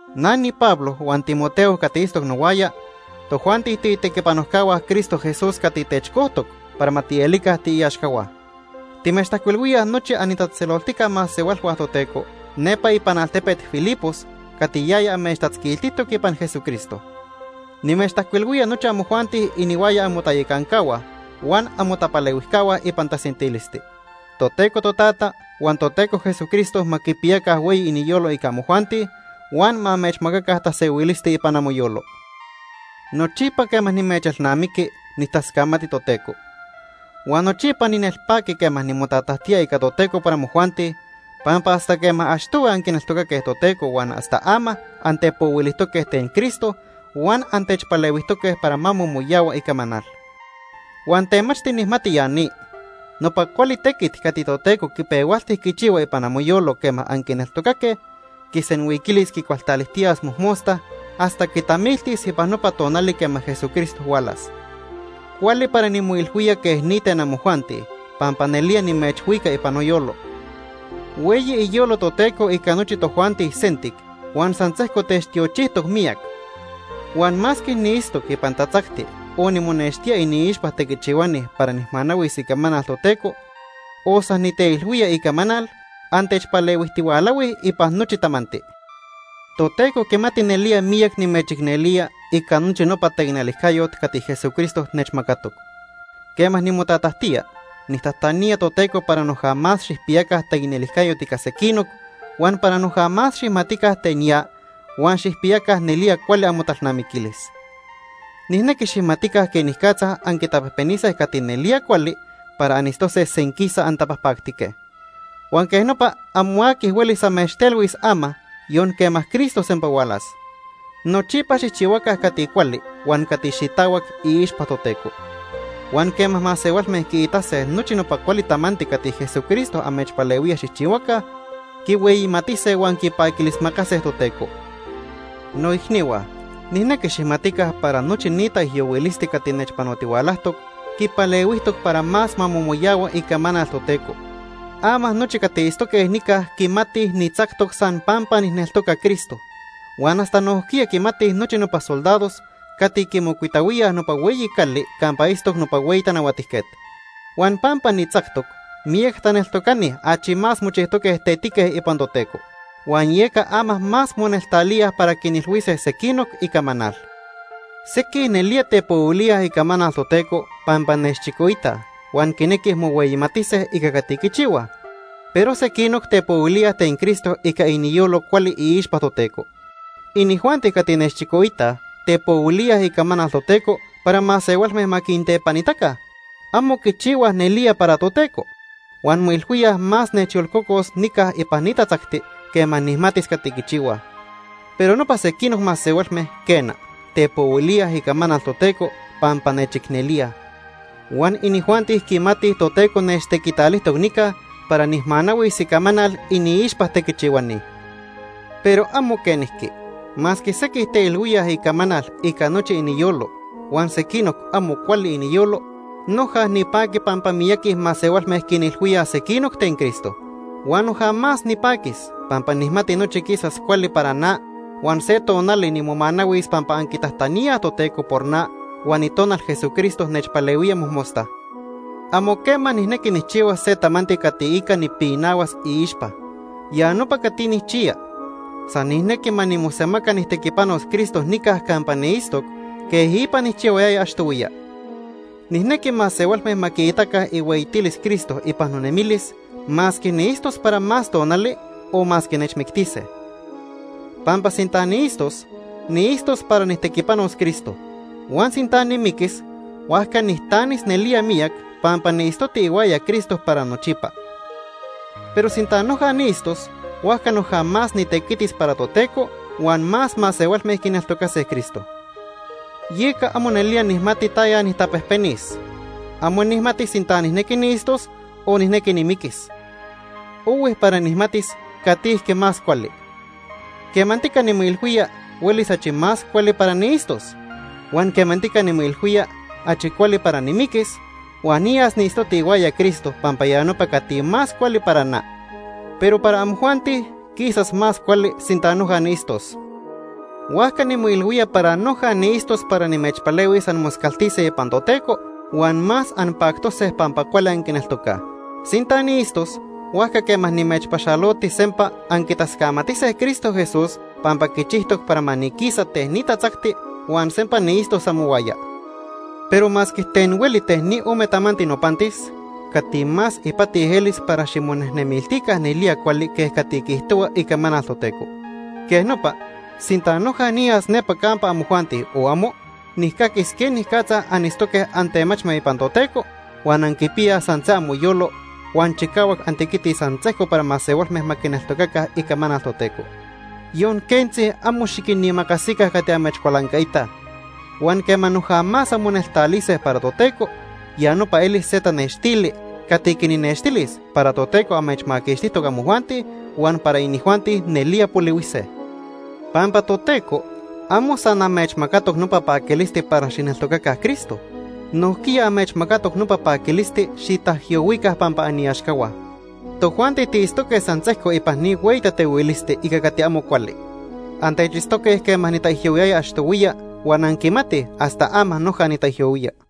Na niPablo huan Timoteo cati itztoc nohuaya, tojuanti tiitequipanojcahua Cristo Jesús cati techcojtoc para ma tielica tiiaxcahua. Timechtajcuilhuíaj nochi anitatzejtzeloltica masehualhua Toteco nepa ipan altepet Filipos cati yaya amechtatzquiltijtoc ipan Jesucristo. Nimechtajcuilhuía nochi amojuanti inihuaya amotayacancahua huan amotapalehuijcahua ipan tasentilisti. Toteco Totata huan Toteco Jesucristo ma quipiyaca hueyi iniyolo ica amojuanti, huan ma amechmacaca tasehuilisti ipan amoyolo. Nochipa quema nimechelnamiqui, nijtascamati Toteco. Huan nochipa ninelpaqui quema nimotatajtía ica Toteco por amojuanti, pampa hasta quema achtohui anquineltocaque Toteco huan hasta ama antepohuilijtoque ten Cristo huan antechpalehuijtoque para ma momoyahua icamanal. Huan temachti nijmati ya ni. Nopa cuali tequit cati Toteco quipehualti quichihua ipan amoyolo quema anquineltocaque, quisenhuiquilis quicualtalijtiyas mojmosta hasta quitamiltis ipan nopa tonali quema Jesucristo hualas. Cuali para nimoilhuía quej ni ten amojuanti pampa nelía nimechhuica ipan noyolo. Hueyi iyolo Toteco ica nochi tojuanti sentic huan san sejco techtiochijtoc miyac. Huan masque niitztoc ipan tatzacti, o nimonextía iniixpa tequichihuani para nijmanahuis icamanal Toteco, o san niteilhuía icamanal, antechpalehuijtihualahuij ipan nochi tamanti. Toteco quimati nelía miyac nimechicnelía ica nochi nopa taicnelijcayot cati Jesucristo nechmacatoc. Quema nimotatajtía, nijtajtanía Toteco para noja más xijpiyaca taicnelijcayot ica sequinoc, huan para noja más xijmatica ten ya, huan xijpiyaca nelía cuali amotalnamiquilis. Nijnequi xijmatica quenicatza anquitapejpenise cati nelía cuali para anitztose senquisa antapajpactique. Huan quej nopa amo aqui huelis amechtelhuis ama, yon quema Cristo sempa hualas. Nochipa xijchihuaca cati cuali huan cati xitahuac iixpa Toteco. Huan quema masehualme quiitase nochi nopa cuali tamanti cati Jesucristo amechpalehuía xijchihuaca, quihueyimatise huan quipaquilismacase Toteco. Noicnihua, nijnequi xijmatica para nochi ni taijyohuilisti cati nechpanotihualajtoc quipalehuijtoc para más ma momoyahua icamanal Toteco. Ama nochi cati itztoque nica quimatij nitzactoc san pampa nijneltoca Cristo. Huan hasta nojquiya quimatij nochi nopa soldados cati quimocuitahuíaj nopa hueyi cali campa itztoc nopa hueyi tanahuatijquet. Huan pampa nitzactoc, miyac taneltocani achi más mochijtoque tetique ipan Toteco, huan yeca ama más moneltalíaj para quinilhuise sequinoc icamanal. Sequij nelía tepohuilíaj icamanal Toteco pampa nechchicoitaj huan quinequij mohueyimatise ica cati quichihuaj, pero sequinoc tepohuilíaj ten Cristo ica iniyolo cuali iixpa Toteco. Inijuanti cati nechchicoitaj tepohuilíaj icamanal Toteco para masehualme ma quintepanitaca. Amo quichihuaj nelía para Toteco. Huan moilhuíaj más nechyolcocos nica ipan ni tatzacti quema nijmatis cati quichihuaj. Pero nopa sequinoc masehualme, quena, tepohuilíaj icamanal Toteco pampa nechicnelíaj. Huan inijuanti quimatij Toteco nechtequitalijtoc nica para nijmanahuis icamanal iniixpa tequichihuani. Pero amo quenijqui. Masque sequij teilhuíaj icamanal ica nochi iniyolo huan sequinoc amo cuali iniyolo, noja nipaqui pampa miyaqui masehualme quinilhuíaj sequinoc ten Cristo. Huan noja más nipaquis, pampa nijmati nochi quisas cuali para na huan se tonali nimomanahuis pampa anquitajtaníaj Toteco por na huan Itonal Jesucristo nechpalehuía mojmosta. Amo quema nijnequi nijchihuas se tamanti cati ica nipinahuas iixpa. Ya nopa cati nijchiya. San nijnequi ma nimosemaca nijtequipanos Cristo nica campa niitztoc quej ipa nijchihuayaya achtohuiya. Nijnequi masehualme ma quiitaca ihueyitilis Cristo ipan nonemilis, masque niitztos para más tonali o masque nechmictise. Pampa sinta niitztos, niitztos para nijtequipanos Cristo. Huan sinta nimiquis, huajca nijtanis nelía miyac, pampa niitztoti ihuaya Cristo para nochipa. Pero sinta noja niitztos, huajca noja más nitequitis para Toteco huan más masehualme quineltocase Cristo. Yeca amo nelía nijmati taya nijtapejpenis. Amo nijmati sinta nijnequi niitztos o nijnequi nimiquis. Ohui para nijmatis catijque más cuali. Quemantica nimoilhuía huelis achi más cuali para niitztos. Huan quemantica nimoilhuía achi cuali para nimiquis huan niyas niitztoti ihuaya Cristo pampa ya nopa cati más cuali para na. Pero para amojuanti quisas más cuali sinta noja niitztos. Huajca nimoilhuía para noja niitztos para nimechpalehuis anmoscaltise ipan Toteco huan más anpactose pampa cuali anquineltocaj. Sinta niitztos, huajca quema nimechpaxaloti sempa anquitascamatise Cristo Jesús pampa quichijtoc para ma niquisa ten ni tatzacti huan sempa niitztos amohuaya. Pero masque ten hueli ten ni ome tamanti nopantis, cati más ipati elis para ximonejnemiltica nelía cuali quej cati quiijtohua icamanal Toteco. Quej nopa, sinta noja niyas nepa campa amojuanti o amo, nijcaquis quenicatza anitztoque antemachme ipan Toteco, huan anquipiyaj san se amoyolo, huan chicahuac antequitij san sejco para masehualme ma quineltocaca icamanal Toteco. Yon quentzi amo xiquinimacasica cati amechcualancaitaj. Huan quema noja más anmoneltalise para Toteco, ya nopa elis se tanextili cati quinnextilis para Toteco amechmaquixtijtoc amojuanti huan para inijuanti nelía polihuise. Pampa Toteco amo san amechmacatoc nopa paquilisti para xijneltocaca Cristo, nojquiya amechmacatoc nopa paquilisti xitaijyohuica pampa aniaxcahua. Tojuanti tiitztoque san sejco ipan ni hueyi tatehuilisti ica cati amo cuali. Antechitztoque quema nitaijyohuiyaya achtohuiya huan anquimatij hasta ama noja nitaijyohuía.